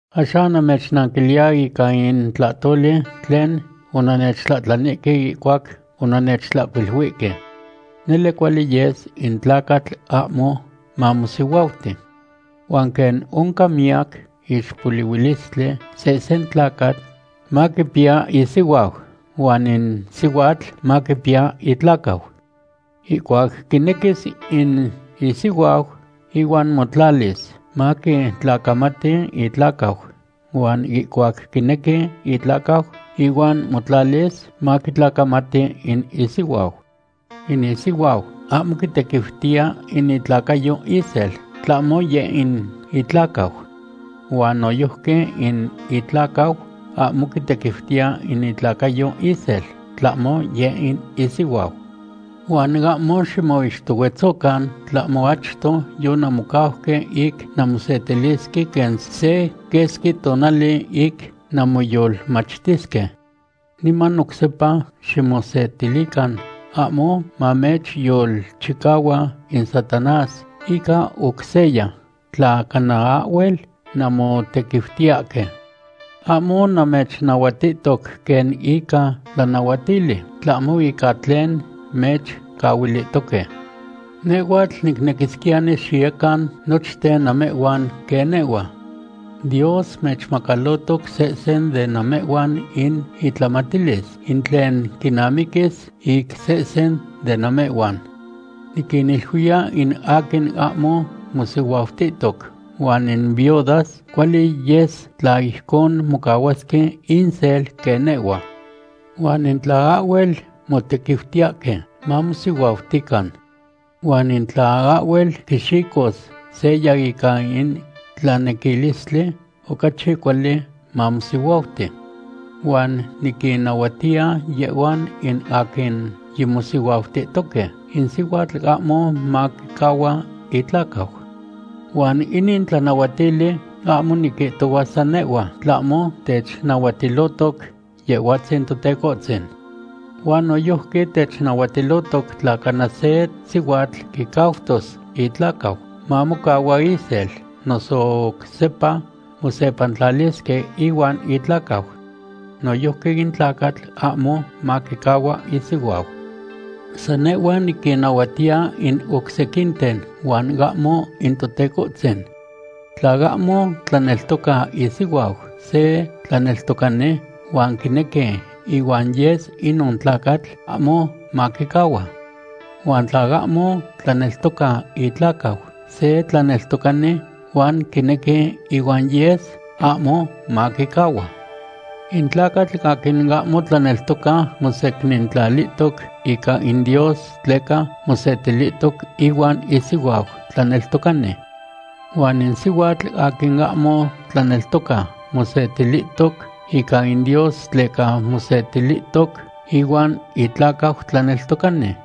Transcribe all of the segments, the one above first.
Axan namechnanquiliya ica in tlahtoli tlen onannechtlahtlanihque ihcuac onannechtlahcuiluihque. Nele cuali yes in tlacatl ahmo mamosihuauti. Huan quen oncan miyac ixpolihuilistli, sehsen tlacatl maquipiya isihuau huan in sihuatl maquipiya itlacau. Ihcuac quinequis in isihuau ihuan motlalis, maquitlacamati itlacau, huan ihcuac quinequi itlacau ihuan motlalis, maquitlacamati in isihuau. In isihuau ahmo quitequiutiya in itlacayo isel, tlahmo yeh in itlacau. Huan noyojqui in itlacau ahmo quitequiutiya in itlacayo isel, tlahmo yeh in isihuau. Huan ahmo ximoixtohuetzocan, tlahmo achto yonanmocauque ic nanmosetilisque se quesqui tonali ic nanmoyolmachtisque. Niman oc sepa ximosetilican, ahmo mamechyolchicahua in Satanás ica oc seya, tla cana ahhuel nanmotequiutiyahque. Ahmo namechnahuatihtoc quen ica tlanahuatili, tlahmo ica tlen mechcahuilihtoque. Nehhuatl nicnequisquiyani xiyecan nochten namehhuan quen nehhua. Dios mechmacalotoc sehsen de namehhuan in itlamatilis, in tlen quinamiquis ic sehsen de namehhuan. Niquiniluiya in aquin ahmo mosihuautihtoc huan in viudas, cuali yes tla ijcon mocahuasque insel quen nehhua. Huan in tla ahhuel motequiutiyahque, mamosihuautican. Huan in tla ahhuel quixicos seya ica in tlanequilistli, ocachi cuali mamosihuauti. Huan niquinnahuatiya yehhuan in aquin yimosihuautihtoque, in sihuatl ahmo maquicahua itlacau. Huan inin tlanahuatili ahmo niquihtohua san nehhua, tlahmo technahuatilohtoc Yehhuatzin Totecohtzin. Huan noyojqui technahuatilohtoc tla cana se sihuatl quicautos itlacau, mamocahua isel noso oc sepa mosepantlalisque ihuan itlacau. Noyojqui in tlacatl ahmo maquicahua isihuau. San nehhua niquinnahuatiya in oc sequinten huan ahmo in Totecohtzin. Tla ahmo tlaneltoca isihuau se tlaneltocani huan quinequi ihuan yes, inon tlacatl ahmo maquicahua. Huan tla ahmo tlaneltoca itlacau se tlaneltocani, huan quinequi ihuan yes, ahmo maquicahua. In tlacatl aquin ahmo tlaneltoca mosecnintlalihtoc ica in Dios tleca mosetilihtoc ihuan isihuau tlaneltocani. Huan in sihuatl aquin ahmo tlaneltoca mosecnintlalihtoc ica in Dios tleca mosetilihtoc ihuan itlacau tlaneltocani.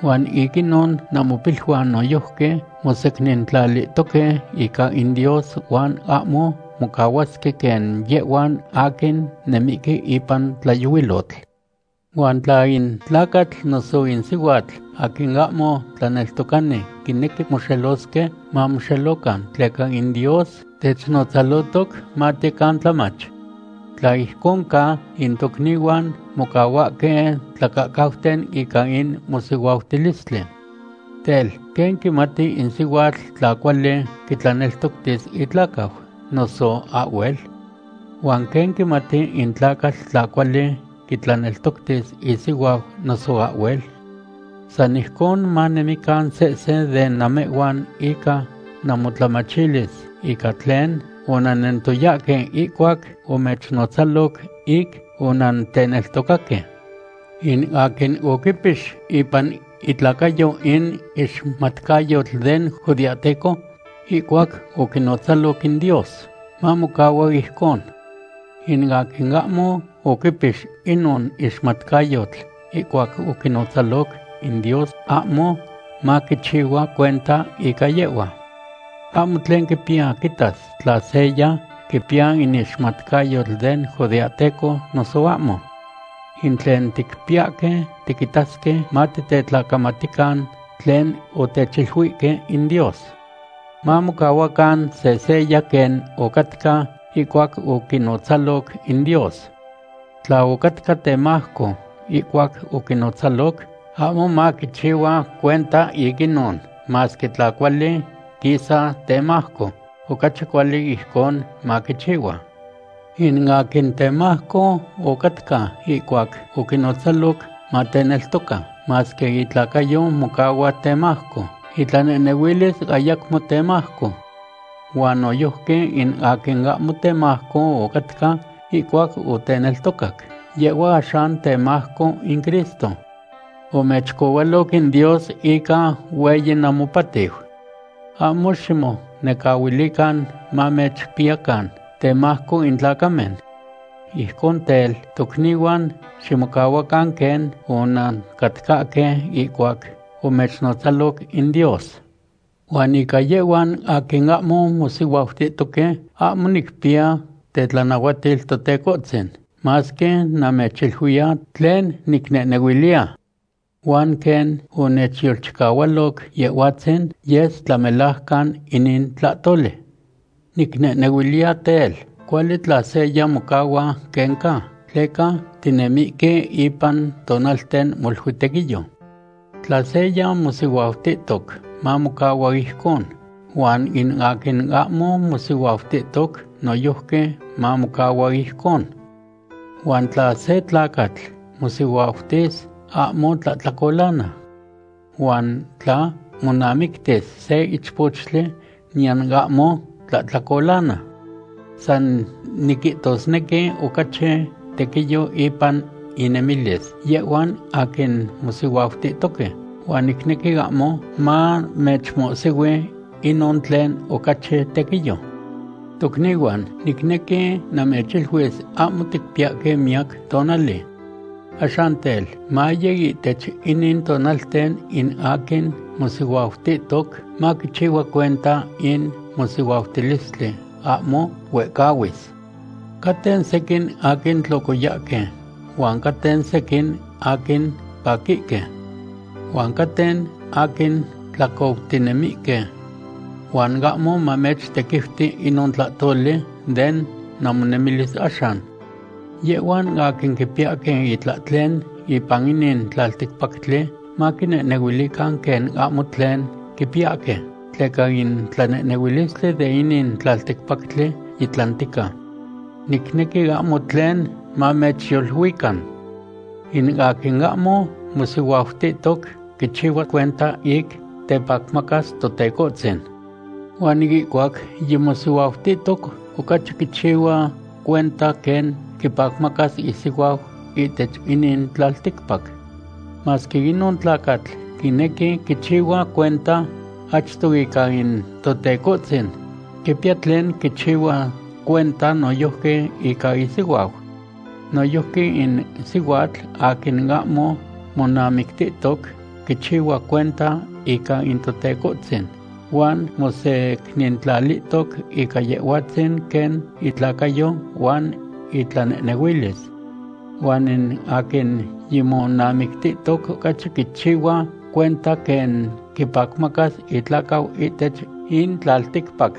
Huan ic inon namopiluan noyojqui mosecnintlalihtoque ica in Dios huan ahmo mocahuasque quen yehhuan aquin nemihque ipan tlayohuilotl. Huan tla in tlacatl noso in sihuatl aquin ahmo tlaneltocani quinequi moxelosque, mamoxelocan, tleca in Dios technotzalohtoc matiyecan tlamach. Tla ijcon ca, in tocnihuan mocahuahque tlacahcauten ica in mosihuautilistli. Tel, ¿quen quimati in sihuatl tla cuali quitlaneltoctis itlacau, noso ahhuel? ¿Huan quen quimati in tlacatl tla cuali quitlaneltoctis isihuau, noso ahhuel? San ijcon manemican sehsen de namehhuan ica namotlamachilis ica tlen onannentoyahque ihcuac omechnotzaloc ic onanteneltocaque. In aquin oquipix ipan itlacayo in ixmatcayotl den judeahteco ihcuac oquinotzaloc in Dios, mamocahua ijcon. In aquin ahmo oquipix inon ixmatcayotl ihcuac oquinotzaloc in Dios, ahmo maquichihua cuenta ica yehhua. Ahmo tlen quipiya quitas tla seya quipiya in ixmatcayotl den judeahteco noso ahmo. In tlen ticpiyahque tiquitasque matitetlacamatican tlen otechiluihque in Dios. Mamocahuacan sehseya quen ocatca ihcuac oquinotzaloc in Dios. Tla ocatca temajco ihcuac oquinotzaloc, ahmo maquichihua cuenta ic inon, masque tla cuali quisa temajco, ocachi cuali ijcon maquichihua. In aquin temajco ocatca ihcuac oquinotzaloc mateneltoca, masque itlacayo mocahua temajco, itlanehnehuilis ayacmo temajco. Huan noyojqui in aquin ahmo temajco ocatca ihcuac oteneltocac, yehhua axan temajco in Cristo. Omechcohualoc in Dios ica hueyi namopatiu. Ahmo ximonecahuilican mamechpiyacan temajco in tlacamen. Ijcon tel, tocnihuan, ximocahuacan quen onancatcahque ihcuac omechnotzaloc in Dios. Huan ica yehhuan aquin ahmo mosihuautihtoque, ahmo nicpiya tetlanahuatil Totecohtzin, masque namechiluiya tlen nicnehnehuiliya. Huan quen onechyolchicahualoc Yehhuatzin, yes tlamelajcan inin tlahtoli. Nicnehnehuiliya tel, cuali tla seya mocahua quen ca, tleca tinemihque ipan tonalten molui tequiyo. Tla seya mosihuautihtoc, mamocahua ijcon, huan in aquin ahmo mosihuautihtoc, noyojqui mamocahua ijcon. Huan tla se tlacatl mosihuautis, ahmo tlahtlacolana. Huan tla monamictis se ichpochtli, niyan ahmo tlahtlacolana. San niquihtosnequi ocachi tequiyo ipan innemilis yehhuan aquin mosihuautihtoque, huan nicnequi ahmo mamechmohsihui inon tlen ocachi tequiyo. Tocnihuan, nicnequi namechiluis ahmo ticpiyahque miyac tonali. Axan tel, maye ihtech inin tonalten in aquin mosihuautihtoc maquichihua cuenta in mosihuautilistli ahmo huehcahuis. Caten sequin aquin tlocoyahque huan caten sequin aquin paquihque. Huan caten aquin tlacoutinemihque. Huan ahmo mamechtequiuti inon tlahtoli den namonemilis axan. Yehhuan aquin quipiyahque itlahtlen ipan inin tlalticpactli, maquinehnehuilican quen ahmo tlen quipiyahque, tleca in tlanehnehuilistli de inin tlalticpactli yitlantica. Nicnequi ahmo tlen mamechyoluican. In aquin ahmo mosihuautihtoc quichihua cuenta ic tepacmacas Totecohtzin. Huan ihcuac yimosihuautihtoc, ocachi quichihua cuenta quen quipacmacas isihuau ihtech inin tlalticpac. Masque inon tlacatl quinequi quichihua cuenta achto ica in Totecohtzin, quipiya tlen quichihua cuenta noyojqui ica isihuau. Noyojqui in sihuatl aquin ahmo monamictihtoc quichihua cuenta ica in Totecohtzin huan mosecnintlalihtoc ica Yehhuatzin quen itlacayo huan itlanehnehuilis. Huan in aquin yimonamictihtoc ocachi quichihua cuenta quen quipacmacas itlacau ihtech in tlalticpac.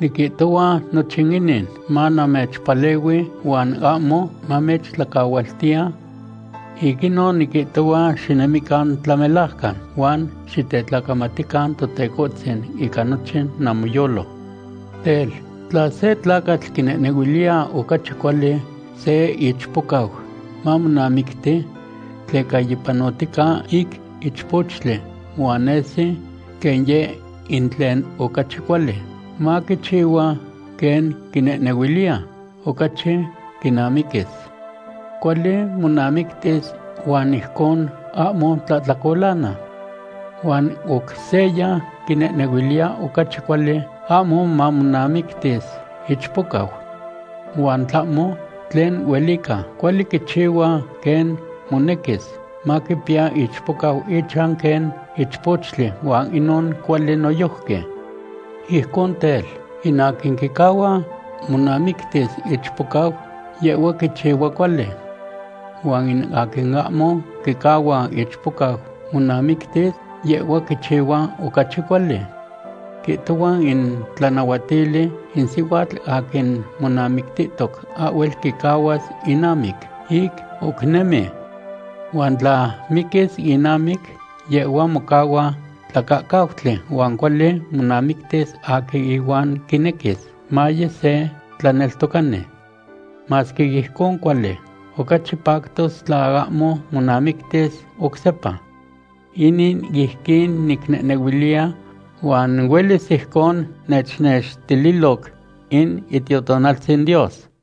Niquihtohua nochin inin manamechpalehui huan ahmo namechtlacahualtiya. Ic inon niquihtohua xinemican tlamelajcan, huan xitetlacamatican Totecohtzin ica nochin namoyolo. Tel, tla se tlacatl quinehnehuiliya ocachi cuali se ichpocau mamonamicti tleca yipanohtica ic ichpochtli huan nesi quen yeh in tlen ocachi cuali, maquichihua quen quinehnehuiliya ocachi quinamiquis. Cuali monamictis huan ijcon ahmo tlahtlacolana. Huan oc seya quinehnehuiliya ocachi cuali ahmo monamictis ichpocau. Huan tlahmo tlen huelica, cuali quichihua quen monequis, maquipiya ichpocau ichan quen ichpochtli huan inon cuali noyojqui. Ijcon tel, in aquin quicahua monamictis ichpocau, yehhua quichihua cuali. Huan in aquin ahmo quicahua ichpocau monamictis, yehhua quichihua ocachi cuali. Quihtohua in tlanahuatili in sihuatl aquin monamictihtoc ahhuel quicahuas inamic, ic oc nemi. Huan tla miquis inamic yehhua mocahua tlacahcautli huan cuali monamictis aquin ihuan quinequis, maye se tlaneltocani. Masque ijcon cuali, ocachi pactos tla ahmo monamictis oc sepa. Inin ijquin nicnehnehuiliya huan huelis ijcon nechnextililoc in Itiotonaltzin Dios.